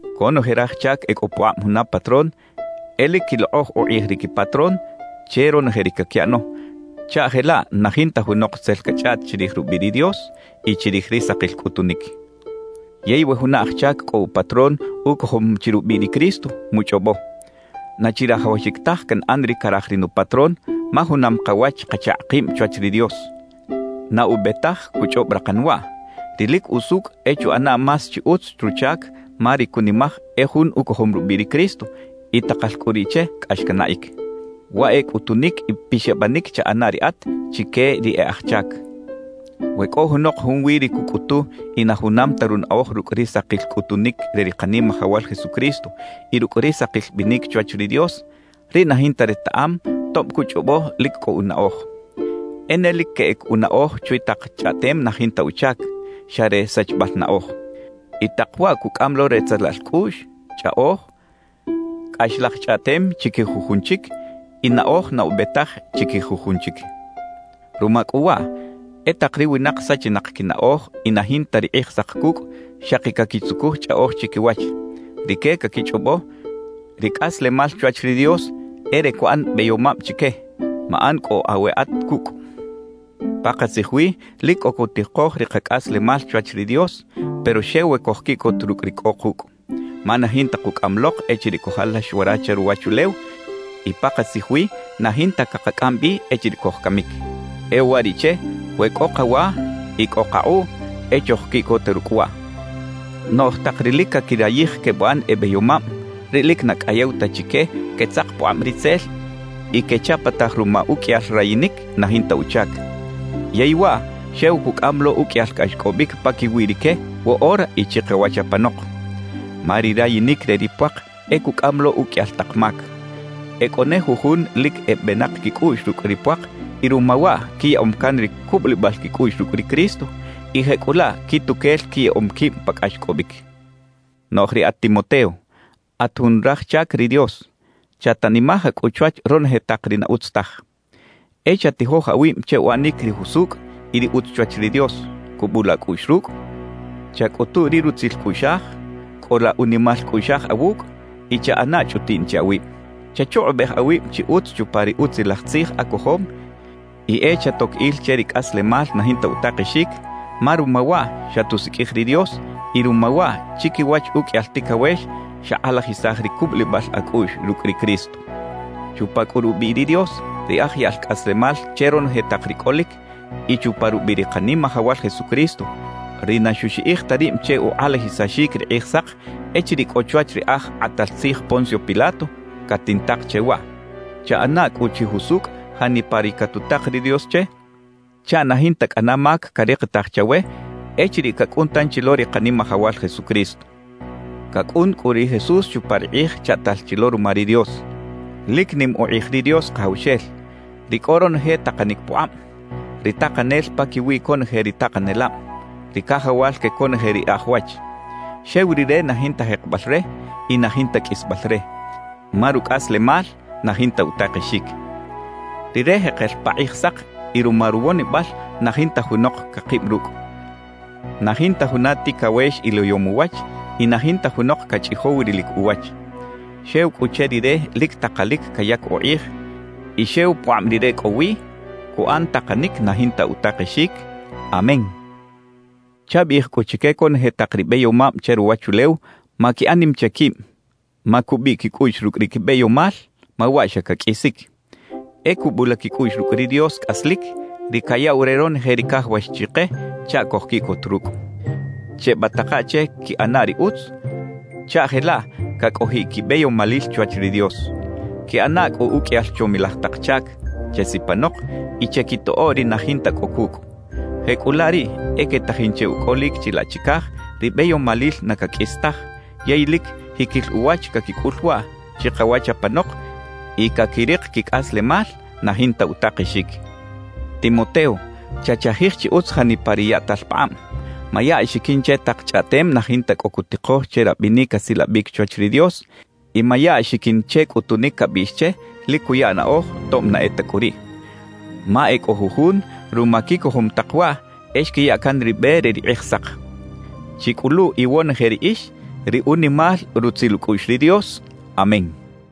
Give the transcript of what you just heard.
Conoje raj chac e cꞌo pukꞌab juna patrón e lic quilokꞌoj ukꞌij ri quipatrón che ronoje ri caquiꞌano, chaꞌ jelaꞌ na jinta junok tzel cachꞌaꞌt chirij rubiꞌ ri Dios y chirij ri sakil cꞌutunic. Yey we juna aj chac cꞌo upatrón ucojom chi rubiꞌ ri Cristo, muchꞌobo: «Na chirajawaxic taj canꞌan ri caraj ri nupatrón ma junam kawach kachakꞌ kib chwach ri Dios.» Na ube taj cuchꞌob rakan waꞌ; ri lic usucꞌ e chuꞌana más chi utz ruchac ma ri cunimaj e jun ucojom rubiꞌ ri Cristo y takal cꞌu riꞌ che cꞌax canaꞌic. Waꞌ e cꞌutunic y pixabanic chaꞌana riꞌat chique ri e aj chac. We cꞌo junok junwi ri cucꞌutu y na junam ta runaꞌoj rucꞌ ri sakil cꞌutunic re ri Kanimajawal Jesucristo y rucꞌ ri sakil binic chwach ri Dios, riꞌ na jinta retaꞌam tob cuchꞌobo lic cꞌo unaꞌoj. E ne lic queꞌec unaꞌoj chwi tak chꞌaꞌtem na jinta uchac, xa re sachibal naꞌoj. Y tak waꞌ cucꞌam lo retzelal cꞌuꞌx, chꞌaꞌoj, cꞌaxlaj chꞌaꞌtem chiquij jujun chic y naꞌoj na ube taj chiquij jujun chic. Ruma cꞌu waꞌ, e tak ri winak sachinak quinaꞌoj y na jinta ri Kꞌijsak cucꞌ, xaki caquitzucuj chꞌaꞌoj chiquiwach. Rique caquichꞌobo, ri cꞌaslemal chwach ri Dios e re cuꞌan beyomab chique. Maꞌan cꞌu aweꞌat cucꞌ. Pakatzij wi lic cꞌo cutikoj ri kacꞌaslemal chwach ri Dios, pero xew we cojquiꞌcot rucꞌ ri cꞌo kucꞌ. Ma na jinta kucꞌaꞌam lok echiriꞌ cojalax wara che ruwachulew y pakatzij wi na jinta cakacꞌam bi echiriꞌ cojcamic. E uwariꞌche we cꞌo kawa y cꞌo kakꞌuꞌ, e chojquiꞌcota rucꞌ waꞌ. Noꞌj tak ri lic caquirayij quebuꞌan e beyomab, riꞌ lic na cꞌayew ta chique quetzak pukꞌab ritzel y quechapataj ruma uqꞌuiyal rayinic na jinta uchac. Yey waꞌ xew cucꞌam lo uqꞌuiyal cꞌaxcꞌobic paquiwi rique woꞌora y chikawach apanok. Ma ri rayinic re ri puak e cucꞌam lo uqꞌuiyal tak mac. E cꞌo ne jujun lic e benak quicꞌuꞌx rucꞌ ri puak y ruma waꞌ quiyaꞌom can ri cubulibal quicꞌuꞌx rucꞌ ri Cristo, y jecꞌulaꞌ quituquel quiyaꞌom quib pa cꞌaxcꞌobic. Noꞌj riꞌat Timoteo, at jun raj chac ri Dios, chatanimaja cꞌu chwach ronoje tak ri na utz taj. E chatijoj awib che uꞌanic ri jusucꞌ y ri utz chwach ri Dios, cubula acꞌuꞌx rucꞌ, chacꞌutu ri rutzil cꞌuꞌxaj, cꞌola unimal cꞌuꞌxaj awucꞌ y chaꞌana chꞌutiꞌn che awib. Chachukꞌubej awib chi utz chupa ri Utzilaj Tzij acojom y e chatoc il che ri cꞌaslemal na jinta utakexic, ma ruma waꞌ xatusiqꞌuij ri Dios y ruma waꞌ chiquiwach uqꞌuiyal ticawex xakꞌalajisaj ri cubulibal acꞌuꞌx rucꞌ ri Cristo. Chupa cꞌu rubiꞌ ri Dios, ri aj yaꞌl cꞌaslemal che ronoje tak ri cꞌolic, y chupa rubiꞌ ri Kanimajawal Jesucristo, ri na xuxiꞌij ta rib che ukꞌalajisaxic ri Kꞌijsak echiriꞌ cꞌo chwach ri aj kꞌatal tzij Poncio Pilato, catintak che waꞌ: Chaꞌana cꞌu chi jusucꞌ janipa ri catutak ri Dios che chaꞌ na jinta cꞌana mac carikitaj chawe echiriꞌ cacꞌun tanchi lo ri Kanimajawal Jesucristo. Cacꞌun cꞌu ri Jesús chupa ri kꞌij chaꞌtal chi lo ruma ri Dios. Lic nim ukꞌij ri Dios Kajawxel, ri cꞌo ronoje takanic pukꞌab, ri Takanel paquiwi conoje ri takanelab, ri Cajawal que conoje ri e aj wach. Xew Rire na jinta jekebal re y na jinta qꞌuisbal re, ma rucꞌaslemal na jinta utakexic. Rire jekel pa Kꞌijsak y ruma ruwonibal na jinta junok cakib rucꞌ. Na jinta juna ticawex iliyom uwach y na jinta junok cachꞌijow rilic uwach. Xew cꞌu che Rire lic takalic cayac ukꞌij y xew pukꞌab Rire cꞌo wi cuꞌan takanic na jinta utakexic. ¡Amén! Chabiꞌij cꞌu chique conoje tak ri beyomab che ruwachulew maquiꞌan nim che quib, macubiꞌ quicꞌuꞌx rucꞌ ri quibeyomal ma waꞌ xa caqꞌuisic; e cubula quicꞌuꞌx rucꞌ ri Dios cꞌaslic, ri cayaꞌw re ronoje ri cajawax chike chaꞌ cojquiꞌcot rucꞌ. Chebataka che quiꞌana ri utz chaꞌ jelaꞌ cacꞌojiꞌ quibeyomalil chwach ri Dios. Quiꞌana cꞌu uqꞌuiyal chomilaj tak chac, chesipanok y chequitoꞌo ri na jinta cꞌo cucꞌ. Jecꞌulaꞌ riꞌ e quetajin che ucꞌolic chilaꞌ chicaj ri beyomalil na caqꞌuis taj, yey lic jiquil uwach caquicꞌul waꞌ chikawach apanok y caquirik quicꞌaslemal na jinta utakexic. Timoteo, chachajij chi utz janipa ri yaꞌtal pakꞌab; maya axiquin che tak chꞌaꞌtem na jinta cꞌo cutikoj che rabinic asilabic chwach ri Dios y maya axiquin che cꞌutunic cabiꞌx che lic cuya naꞌoj tob na e ta cꞌu riꞌ. Ma e cꞌo jujun ruma quicojom tak waꞌ, e xquiya can ri be re ri Kꞌijsak. Chicꞌulu iwonoje riꞌix ri unimal rutzil ucꞌuꞌx ri Dios. Amén.